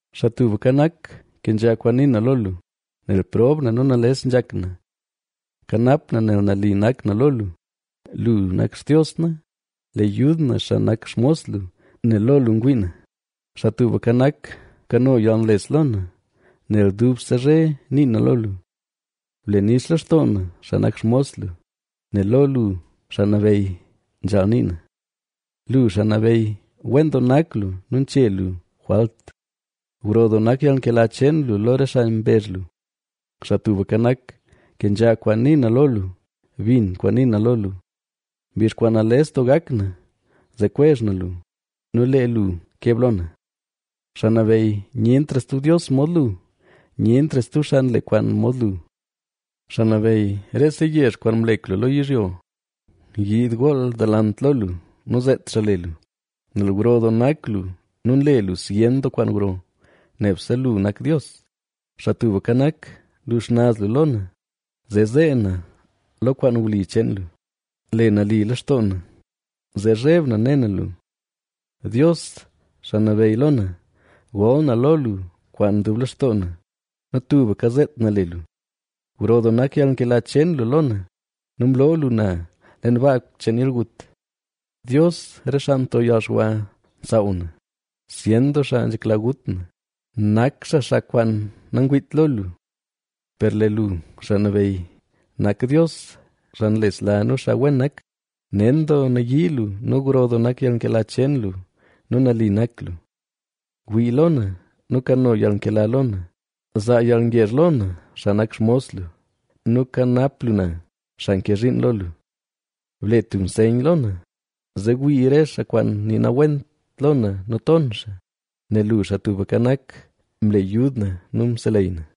Xaa Tubka Nak, kenzha kwaan nii na lo lu, nel prob na nu nales nzhak na. Kanap na nel nali nak na lo lu, ¡lu nak Xtios na, le yud na, xaa nak xmos lu, nel lo lu ngwii na! Xaa Tubka Nak, bkano yalnles lo na, nel dubse zhe nii na lo lu. Ble nix lextoo na, xaa nak xmos lu, nel lo lu, Xaa Nabeyy, nzhaal nii na. Lu, Xaa Nabeyy, wen doo nak lu nu nche lu jwalt, gro doo nak yalnkela cheen lu lo re xaa mbezh lu. Xaa Tubka Nak, kenzha kwaan nii na lo lu, bin kwaan nii na lo lu. Mbizh kwaan nales doo gak na zee kwezh na lu nu lee lu keb lo na. Xaa Nabeyy, nyentra stub dios mod lu, nyentra stub xaa nle kwaan mod lu. Xaa Nabeyy, rese yezh kwaan mlek lu lo yizhyo, yiid gool delant lo lu, nu zeet xaa le lu. Nel gro doo nak lu nu nle lu zyen doo kwaan gro. ¡Nebse lu nak Dios! Xaa Tubka Nak, lu xnaz lu lo na, zee zee na lo kwaan wli cheen lu; le nali lextoo na, zee zheb na ne na lu. Dios, Xaa Nabeyy lo na, gol na lo lu kwaan dub lextoo na, nu tubka zeet na le lu. Gro doo nak yalnkela cheen lu lo na, nu mloo lu na leen baa cheen yalgut. Dios, re xaa nto yalxwa nsaaw na; zyen doo xaa nzhekla gut na, nak xaa xaa kwaan nangwiit lo lu. Per lee lu, Xaa Nabeyy, nak Dios, xaa nlesla nu xaa wen nak, nen doo nayii lu nu gro doo nak yalnkela cheen lu nu nali nak lu. Wii lo na nu kano yalnkela lo na; zaa yalngezh lo na, xaa nak xmos lu nu kanap lu na, xaa nke zhiin lo lu. Ble tub nseyn lo na, zee wii re xaa kwaan nii nawent lo na nu ton xaa, nel lu, Xaa Tubka Nak, mle yud na nu mseleyy na.